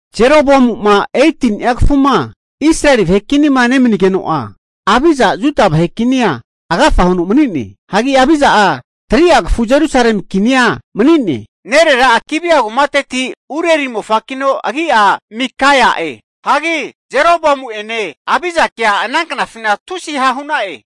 Jeroboamu'ma 18ni'a kafuma Israeli vahe kinima nemanigeno'a, Abija'a Juda vahe kinia agafa huno mani'ne. Hagi Abija'a 3'a kafu Jerusalemia kinia mani'ne. Nerera'a Gibea kumateti Urieli mofakino agi'a Mikaia'e. Hagi Jeroboamu'ene Abijakea ana knafina tusi ha' hu'na'e.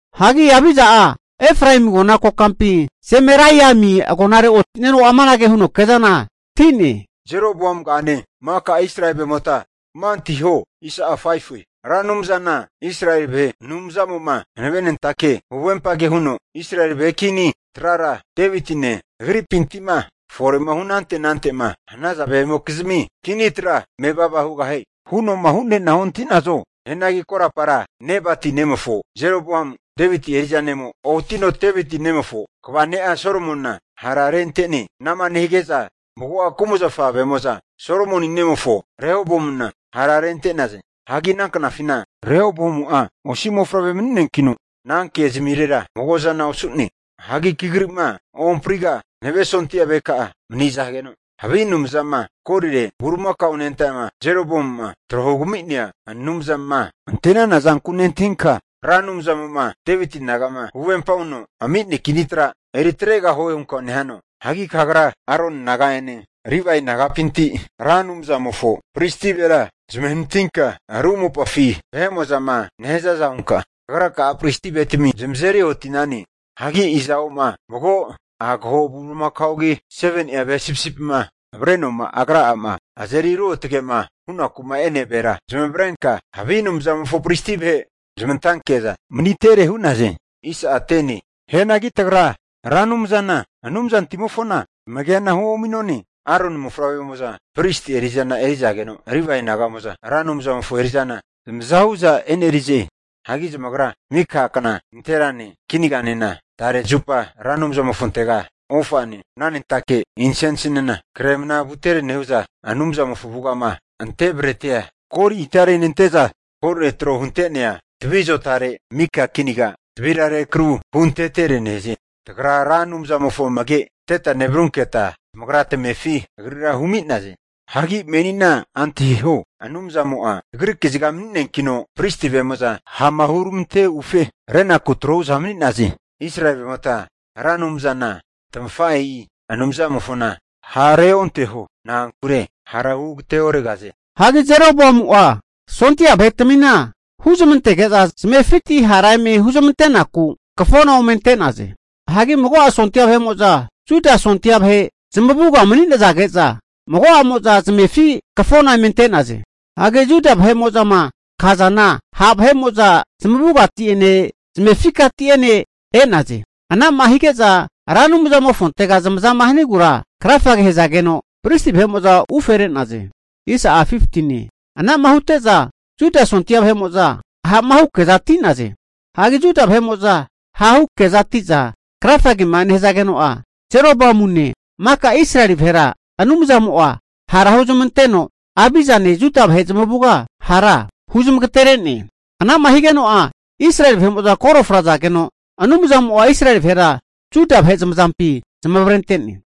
Hagi Abija'a Efraemi agona kokampi Zemaraimi agonare oti'neno amanage huno kezanati'ne, Jeroboamugane, maka Israeli vahe'mota kama antahiho! Ra Anumzana Israeli vahe Anumzamo'ma hanavenentake huvempage huno, Israeli vahe kini trara Devitine agripinti'ma fore hunante anante'ma hanaza vahe'mokizmi kini tra mevava hugahie huno'ma hu'neana ontahi'nazo? Hianagi korapara Nebati nemofo Jeroboamu, Deviti eri'za nemo otino Deviti nemofo kva ne'a Solomonina hararente'ne. Ana'ma nehige'za mago'a kumazafa vahe'mo'za Solomoni nemofo Rehoboamu'na hararente'naze. Hagi ana knafina Rehoboamu'a osi mofavre mani'neankino, ana kezmirera mago zana osu'ne. Hagi kagri'ma ohampriga'a hanave sondia vaheka'a manizageno, havi anumzama golire bulimakao anentama Jeroboamu'ma tro hugami'nea anumzama ante'nana zanku nentahinka, Ra Anumzamo'ma Deviti naga'ma huvempa huno ami'nea kini tra eri atregahue hunka nehano? Hagi kagra Aroni naga'ene, Livae nagapinti Ra Anumzamofo pristi vahera zmahenatinka, ru mopafi vahe'mo'zama nehazaza hunka, kagra'a pristi vahetami zamazeri oti'nane. Hagi iza'oma mago agaho bulimakaogi, 7ni'a ve sipisipima avrenoma agra'ama azeri ruotge'ma hunaku'ma e'nea vahera, zamavarenka havi anumzamofo pristi vahe zmantanke'za manitere hu'naze. Hianagi tagra, Ra Anumzana Anumzantimofona tamagena huomi'none. Aroni mofavremo'za pristi eri'zana erizageno, Livae naga'mo'za Ra Anumzamofo eri'zana zamaza hu'za e'nerize. Hagi zamagra mika kna nanterane, kinaganena tare zupa Ra Anumzamofontega ofane mnanentake insensinena kre mna vuntetere nehu'za, Anumzamofo avugama ante bretia goli itare nente'za, golire tro hunte'nea tavi azotare mika kinaga tavira rekru huntetere nehaze. Tagra Ra Anumzamofo amage anteta nevarurunketa, tamagra tamefi agrira humi'naze. Hagi menina antahiho, Anumzamo'a tagri kaziga mani'neankino, pristi vahe'mo'za ha'ma huramante ufe renaku retro hu'za mani'naze. Israeli vahe'mota Ra Anumzana tamafahe'i Anumzamofona ha' reonteho. Na'ankure hara hu ageteoregahaze. Hagi Jeroboamu'a sondia vahetmina huzmantege'za zamefiti hara eme huzmante'naku kafona ome ante'naze. Hagi mago'a sondia vahe'mo'za Juda sondia vahe zamavuga manizage'za, mago'amo'za zamefi kafona eme ante'naze. Hagi Juda vahe'mo'zama kazana ha' vahe'mo'za zamavugati'ene zamefikati'ene e'naze. Ana'ma hige'za Ra Anumzamofontega zamazama hanigura krafage hazageno, pristi vahe'mo'za ufere'naze. Ana'ma hute'za Juda sondia vahe'mo'za ha'mahu kezati'naze. Hagi Juda vahe'mo'za hahu kezati'za krafagema nehazageno'a, Jeroboamune maka Israeli vahera Anumzamo'a hara huzmanteno, Abijane Juda vahe zamavuga hara huzmagatere'ne. Ana'ma higeno'a, Israeli vahe'mo'za koro frazageno, Anumzamo'a Israeli vahera Juda vahe zamazampi zamavarente'ne.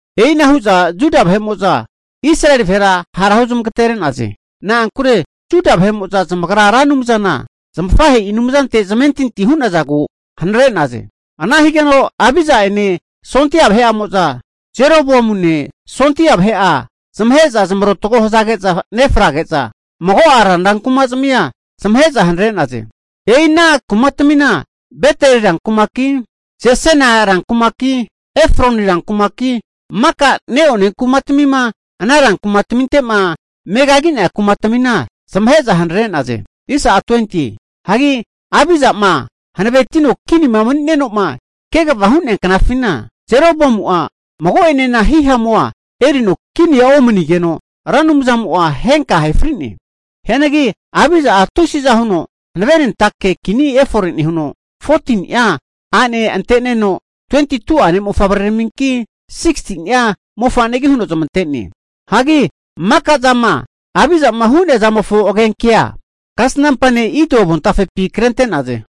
E'ina hu'za Juda vahe'mo'za Israeli vahera hara huzmagatere'naze. Na'ankure Juda vahe'mo'za zamagra Ra Anumzana zamafahe'i Anumzante zamentintia hu'nazagu anara hu'naze. Ana higeno Abija'ene sondia vahe'amo'za Jeroboamune sondia vahe'a zamahe'za zamarotgo hazage'za nefrage'za mago'a ranra kuma'zmia zamahe'za hanare'ne. E'i ana kumatmina, Beteli rankumaki, Jesana rankumaki, Efroni rankumaki, maka neone kumatmima ana rankumataminte'ma megagi'nea kumatmina zamahe'za hanare'naze. Hagi Abija'ma hanaventino kinima mani'neno'ma kegava hu'nea knafina, Jeroboamu'a mago'enena hihamua erino kinia omanigeno, Ra Anumzamo'a henka ahe fri'ne. Hianagi Abija'a tusiza huno hankavenentake kini efore nehuno, 14ni'a a'ne anteneno, 22'a ne' mofavreraminki, 16ni'a mofanegi huno zamante'ne. Hagi maka'zama Abijama hu'nea zamofo agenkea kasnampa ne' Ido avontafepi krente'naze.